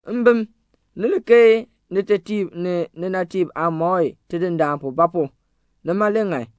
Mbim, ni li keei nitetiib ni ninatiib aamɔi Tidindaan pu; ba pu? nima le ŋan.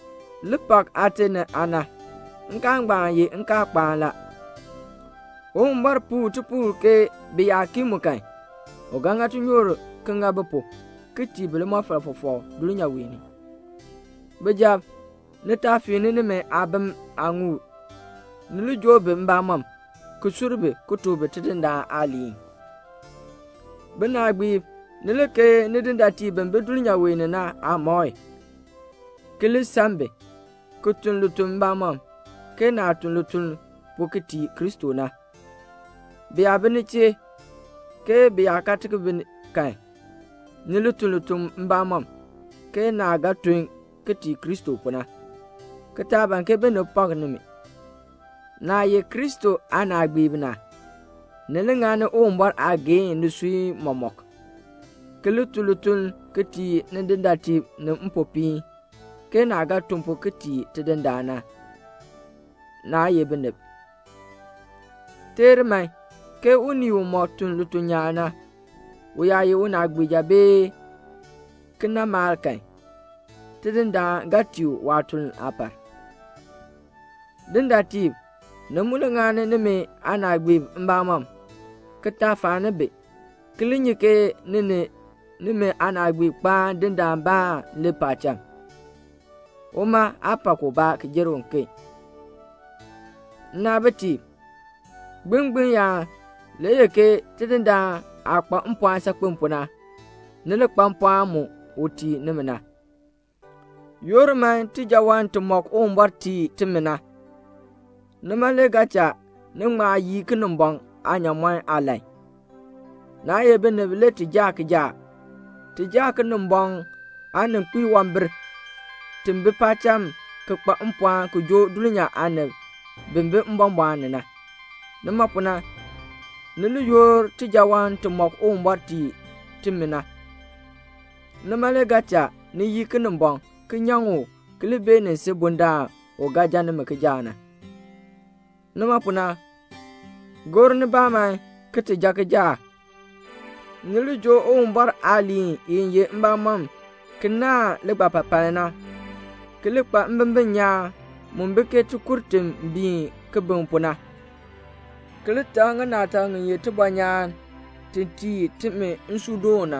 Li pak aate ni aana. Nkaal ngbaan ye nkaalkpaan la. Uwumbɔr puu tipuul ke bi yaa kii mu kan, u ga ŋa tinyoor ki ŋa bi pu, ki tii bi limɔfal fɔfɔk dulnyaa wee ni. Bijab, ni taa fiin nimi aabim aaŋuul. Ni li joo bi mbamɔm, ki sur bi, ki tuk bi Tidindaan aaliin. Binaagbiib, ni li keei nidindaatiib bi bi dulnyaa wee ni na aamɔi, ki li san bi, ki tun lituln mbamɔm, ke naah tun lituln pu ki tii Kristo na. Bi yaa bi ni chee, ke bi yaa kaa bi kan, ni li tun lituln mbamɔm, ke naah ga tun ki tii Kristo pu na, ki taa ban ke binib pak nimi. Naah ye Kristo aanaagbiib na, ni li ŋani Uwumbɔr aageehn nisui mɔmɔk, ki li tun lituln ki tii nidindaatiib ni mpopiin, ke naah ga tun pu ki tii Tidindaan na, naa ye binib. Teer man, ke unii umɔk tun lituln nyaan na, u yaa ye unaagbiija bee kinamalk kan, Tidindaan ga tii u waatuln aapar. Dindaatiib, ni mu li ŋani nimi aanaagbiib mbamɔm, ki taa faani bi, ki li nyi ke ni ni nimi aanaagbiib kpaan Dindaanbaan le paacham. Uma aa pak ubaa ki jer uken. Nnaabitiib, gbilngbiln yaan, Tidindaan aah kpa mpɔɔn saakpen pu na, ni li kpa mpɔɔn mu u tii nimi na. Yoor man tijaawan timɔk Uwumbɔr tii timi na. Nima le ga cha ni ŋma yii Kinimbɔŋ aanyaamɔn aalan. Naa ye binib le ti jaa kijaak. Ti jaa Kinimbɔŋ aanikpiwambir ti bi paacham ki kpa mpɔɔn ki joo dulnyaa aanib bi bi mbɔmbɔɔn ni na. Nima pu na, ni li yoor tijaawan timɔk Uwumbɔr tii timi na. Nima le ga cha ni yii Kinimbɔŋ, ki nyaŋ u ki li beenin si bundaln u ga jan nimi kijaak na. Nima pu na, gor nibaa man ki ti jan kijaak. Ni li joo Uwumbɔr aaliin i ye mbamɔn ki naahn ligbapapaln na; ki li kpa mbimbin nyaan mu bi ke tikur ti biin kibiŋ pu na; ki li tak ŋinaatak ŋi ye tibɔnyaan ti tii timi nsuudoon na;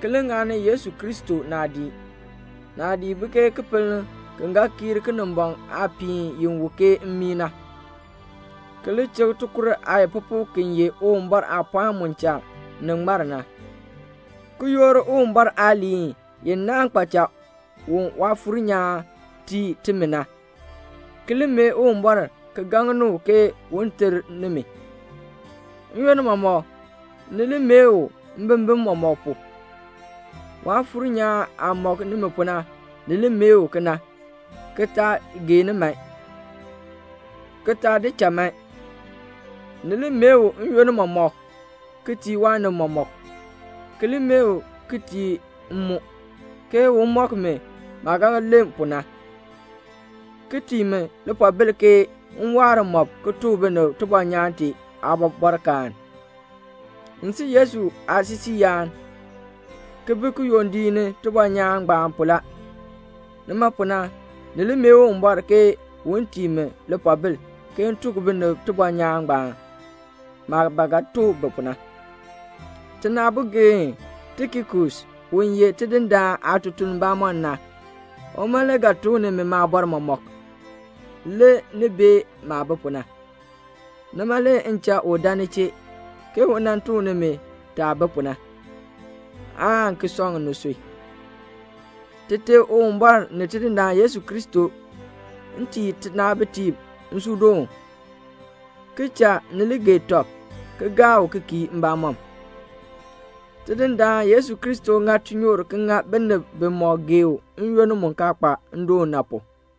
ki li ŋani Yesu Kristo naadii, naadii bi ke kipiln ki ga kiir Kinimbɔŋ aapiihn i wu ke mmii na; ki li chik tikur aayikpupuk ki ye Uwumbɔr aapɔɔn mu cha ni ŋmar na; ki yoor Uwumbɔr aaliin i naahn kpaacha u Waafuur nyaan tii timi na; ki li mee Uwumbɔr ki gaŋni u ke un ter nimi. N-yoonn mɔmɔk ni li mee u mbimbin mɔmɔk pu. Waafuur nyaan aah mɔk nimi pu na, ni li mee u kena, ki taa geeni man, ki taa di cha man. Ni li mee u n-yoonn mɔmɔk ki tii waanib mɔmɔk, ki li mee u ki tii m mu, ke un mɔk mi maah ga len pu na, ki tii mi lipoobil ke m waar mmɔb ki tuk binib tibɔnyaan tee aabɔbɔrkaan. M si Yesu aasisiiyaan, ki bi kiyondiik ni tibɔnyaan ngbaan pu la. Nima pu na, ni li mee Uwumbɔr ke un tii mi lipoobil, ke m tuk binib tibɔnyaan ngbaan, maah ba ga tuk bi pu na. Tinaabogeen Tikikus u ye Tidindaan aatutuln bamɔnn na, uma le ga tuk nimi maabɔr mɔmɔk, le ni bee maah bi pu na. Nima le m cha u buen ni chee, ke un tuk nimi taah bi pu na, aan ki sɔŋ nisui. Tite Uwumbɔr ni Tidindaan Yesu Kristo tii tinaabitiib nsuudoon, ki cha ni li gee tɔb ki gaa u ki kii mbamɔm. Tidindaan Yesu Kristo ŋa tinyoor ki ŋa binib bimɔk gee u n-yoonn mu kaa kpa ndoon na pu.